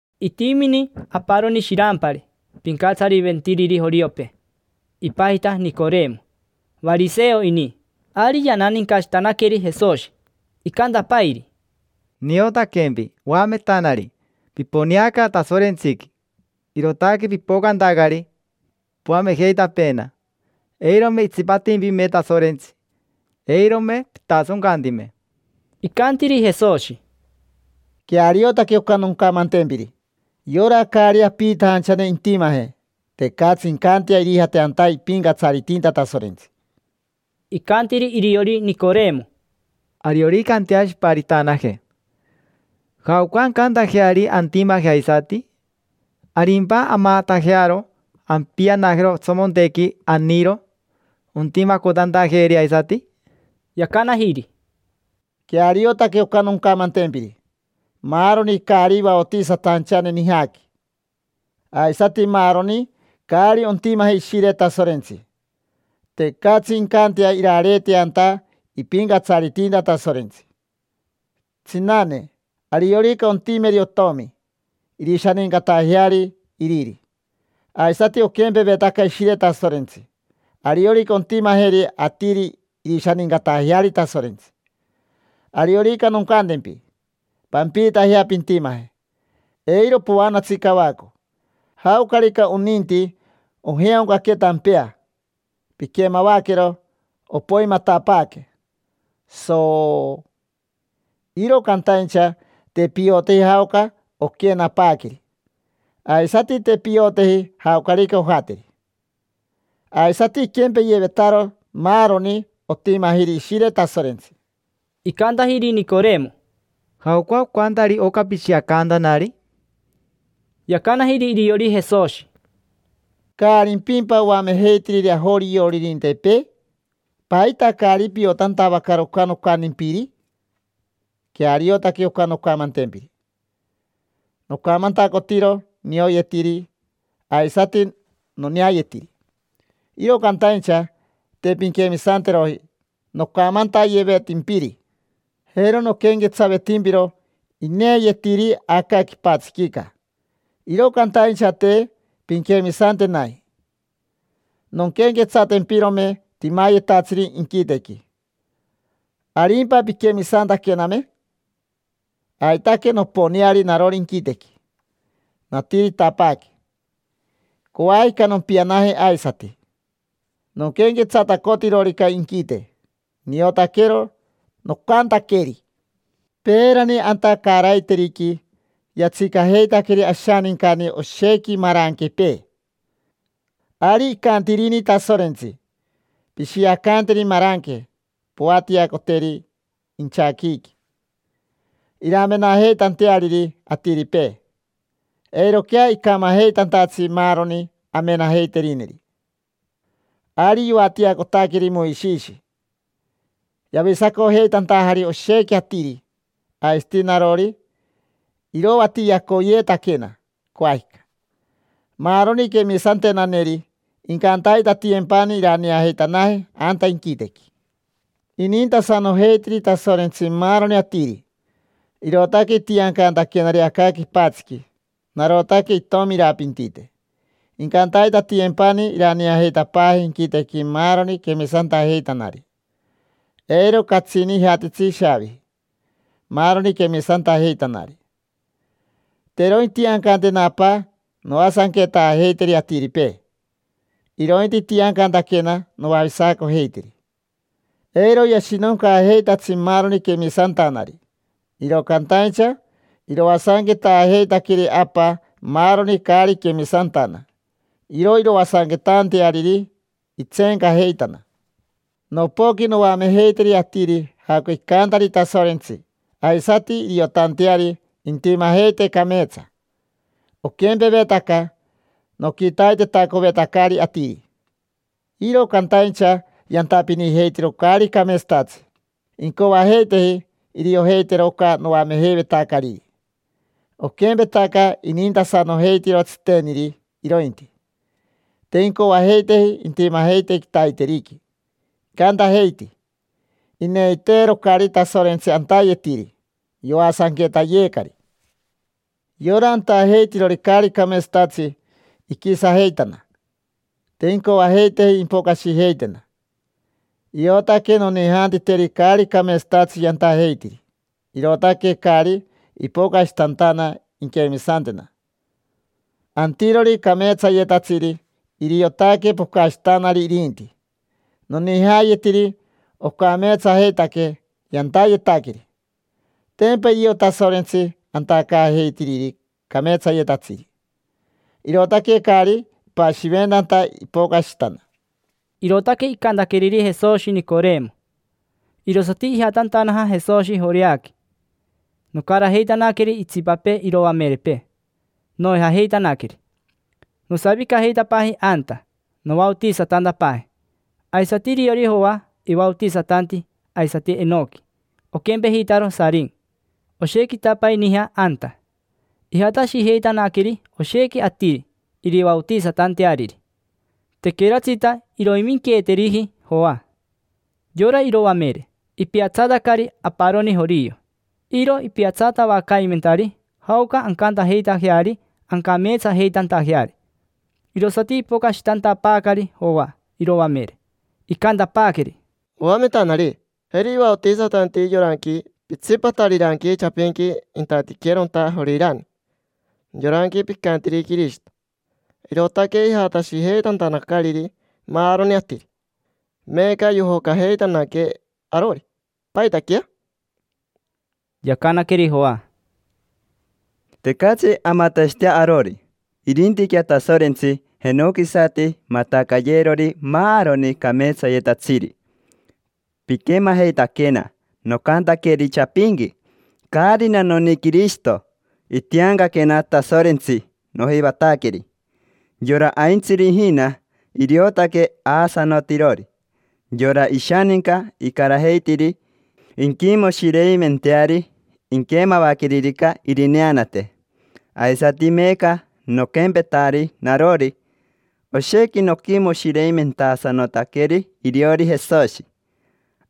Itimini aparoni shirampari pincatsariventiriri joriopee, ipajita Nicoremo. Variseo ini. Ari yananincashitanaqueri Jesoshi, icantapairi: —Niotaquempi, oametanari, piponeaca Tasorentsiqui; irootaque pipocantacari, poamejeitapeena. Eirome itsipatimpime Tasorentsi, eirome pitasoncantime. Icantiri Jesoshi: —Queariotaque oca noncamantempiri: yora caari apiitajanchane intimaje, tecatsi incantea irijate anta ipincatsaritinta Tasorentsi. Icantiri iriori Nicoremo: —Ariorica anteashiparitanaje, ¿jaoca ancantajeari antimaje aisati? ¿Arimpa amatajearo ampianajero otsomontequi anironi ontimacotantajeeri aisati? Yacanajiri: —Queariotaque oca noncamantempiri. Maaroni caari vaotisatajachane nijaqui, aisati maaroni caari ontimaje Ishire Tasorentsi, tecatsi incantea irareetea anta ipincatsaritinta Tasorentsi. Tsinane, ariorica ontimeri otomi, irishanincatajeari iriri. Aisati oquempevetaca Ishire Tasorentsi: ariorica ontimajeri atiri, irishanincatajeari Tasorentsi. Ariorica noncantempi: “Pampiitajea pintimaje”, eiro poanatsi cavaco. Jaocarica oninti, ojeaoncaque tampea, piquemavaquero opoimatapaaque, sooo. Iro cantaincha te pioteji jaoca oquenapaaqueri, aisati te pioteji jaocarica ojateri. Aisati iquempeyevetaro maaroni otimajiri Ishire Tasorentsi. Icantajiri Nicoremo: —¿Jaoca ocantari oca pishiacantanari? Yacanajiri iriori Jesoshi: —¿Caarimpimpa oamejeitiriri ajorioririntepee? ¿Paita caari piotantavacaro oca nocantimpiri? Queariotaque oca noncamantempiri: nocamantacotiro nioyetiri aisati noneayetiri, iro cantaincha te pinquemisanteroji nocamantayevetimpiri. Jero noquenquetsavetimpiro ineeyetiri aca quipatsiquica, iro cantaincha te pinquemisantenaji. Nonquenquetsatempirome timayetatsiri inquitequi, ¿arimpa pinquemisantaquename? Aitaque noponeari narori inquitequi, natiritapaaque; coajica nompianaje aisati. Noquenquetsatacotirorica inquite, niotaquero nocantaqueri. Peerani anta caaraiteriqui yatsicajeitaqueri ashanincani oshequi maranquepee. Ari icantirini Tasorentsi: “Pishiacanteri maranque, poatiacoteri inchaquiiqui iramenajeitanteariri atiripee, eiroquea icamajeitantatsi maaroni amenajeiterineri”. Ari yoatiacotaqueri Moishishi, yavisacojeitantajari oshequi atiri. Aisati narori iroatiacoyeetaquena, coajica. Maaroni quemisantenaneri incantaitatiyempani iraneajeitanaje anta inquitequi. Inintasanojeitiri Tasorentsi maaroni atiri, irootaque itiancantaquenari aca quipatsiqui. Narotaque itomi irapintite. Incantaitatiyempani iraneajeitapaaje inquitequi maaroni quemisantajeitanari; eiro catsini ijatitsi ishaaviji maaroni quemisantajeitanari. Te iro intiancantena Apa noasanquetaajeiteri atiripee, irointi itiancantaquena noavisacojeiteri. Eiro yashinoncaajeitatsi maaroni quemisantanari. Iro cantaincha iroasanquetaajeitaqueri Apa maaroni caari quemisantana. Iro iroasanquetaanteariri, itseencajeitana. Nopoqui noamejeiteri atiri jaoca icantari Tasorentsi aisati iriotanteari intimajeite cameetsa: oquempevetaca noquitaitetacovetacari atiri. Iro cantaincha yantapinijeitiro caari cameetsatatsi, te incoajeiteji iriojeitero oca noamejeivetacariri; oquempetaca inintasanojeitiro tsiteniri irointi. Te incoajeiteji intimajeite quitaiteriqui, icantajeiti: “Ineiteerocari Tasorentsi antayetiri, yoasanquetayeecari”. Yora antajeitirori caari cameetsatsi iquisajeitana. Te incoajeiteji impocashitena: iotaque nonijaantiteri caari cameetsatatsi yantajeitiri, irootaque caari ipocashitantana inquemisantena. Antirori cameetsayetatsiri, iriotaque pocashitanari irinti. Nonijayetiri ocameetsajeitaque yantayetaqueri. Tempa irio Tasorentsi antacaajeitiriri cameetsayetatsiri, irootaque caari ipashiventanta ipocashitana. Irootaque icantaqueriri Jesoshi Nicoremo. Irosati ijatantanaja Jesoshi Joreaqui, nocarajeitanaqueri itsipapee iroamerepee, noijajeitanaqueri. Nosavicajeitapaaji anta, novaotisatantapaaji. Aisati iriori Joa, ivaotisatanti aisati Ainoqui, oquempejitaro Sarimi. Oshequitapai nija anta. Ijatashijeitanaqueri oshequi atiri irivaotisatanteariri. Tequeratsita iroiminqueeteriji Joa. Yora iroamere, ipiatsatacari aparoni jorio. Iro ipiatsatavacaimentari jaoca ancantajeitajeari ancameetsajeitantajeari. Irosati ipocashitantapaacari Joa iroamere, icantapaaqueri: —Oametanari, jeri ivaotisatanti yoranqui pitsipatariranqui chapinqui intatiqueronta Jorirani. Yoranqui picantiri Quirishito. Irootaque ijatashijeitantanacariri maaroni atiri, meeca yojocajeitanaquee arori. ¿Paitaquea? Yacanaqueri Joa: —Tecatsi amatashitea arori, irintiquea Tasorentsi jenoquisati matacayeerori maaroni cameetsayetatsiri. Piquemajeitaquena nocantaqueri chapinqui: “Caarina noni Quirishito. Itiancaquena Tasorentsi nojivataqueri”. Yora aintsiri ijina, iriotaque aasanotirori. Yora ishaninca icarajeitiri inquimoshireimenteari inquemavaqueririca irineanate. Aisati meeca noquempetari narori. Oshequi noquimoshireimentasanotanaqueri iriori Jesoshi.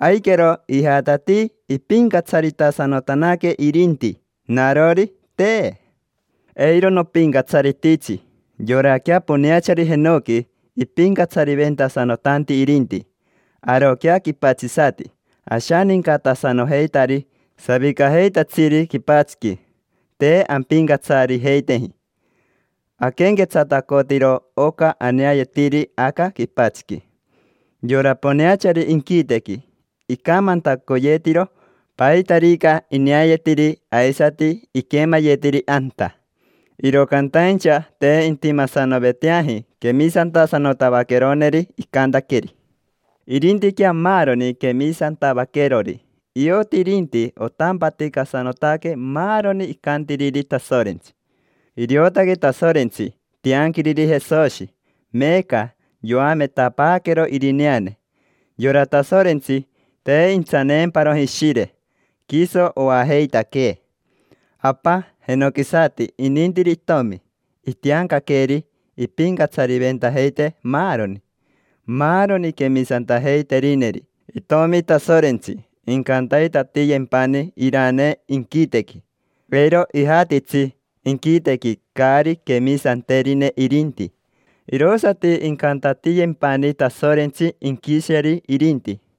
Aiquero ijatatii ipincatsaritasanotanaque irinti. Narori, te: eiro nopincatsarititsi. Yoraquea poneachari jenoqui ipincatsariventasanotanti irinti. Aroquea quipatsisati ashanincatasanojeitari savicajeitatsiri quipatsiqui, te ampincatsarijeiteji. Aquenquetsatacotiro oca aneayetiri aca quipatsiqui. Yora poneachari inquitequi icamantacoyetiro paitarica ineayetiri aisati iquemayetiri anta. Iro cantaincha te intimasanoveteaji quemisantasanotavaqueroneri icantaqueri. Irintiquea maaroni quemisantavaquerori, ioti irinti otampaticatasanotaque maaroni icantiriri Tasorentsi. Iriotaque Tasorentsi tianquiriri Jesoshi, meeca yoametapaaqueero irineane. Yora Tasorentsi te intsaneemparoji Ishire, quiso oajeitaquee. Apa jenoquisati inintiri Itomi, itiancaqueeri ipincatsariventajeitee maaroni. Maaroni quemisantajeiterineri Itomi Tasorentsi incantaitatiyempani iranee inquitequi. Eiro ijatitsi inquitequi caari quemisanterine irinti, irosati incantatiyempani Tasorentsi inquisheri irinti.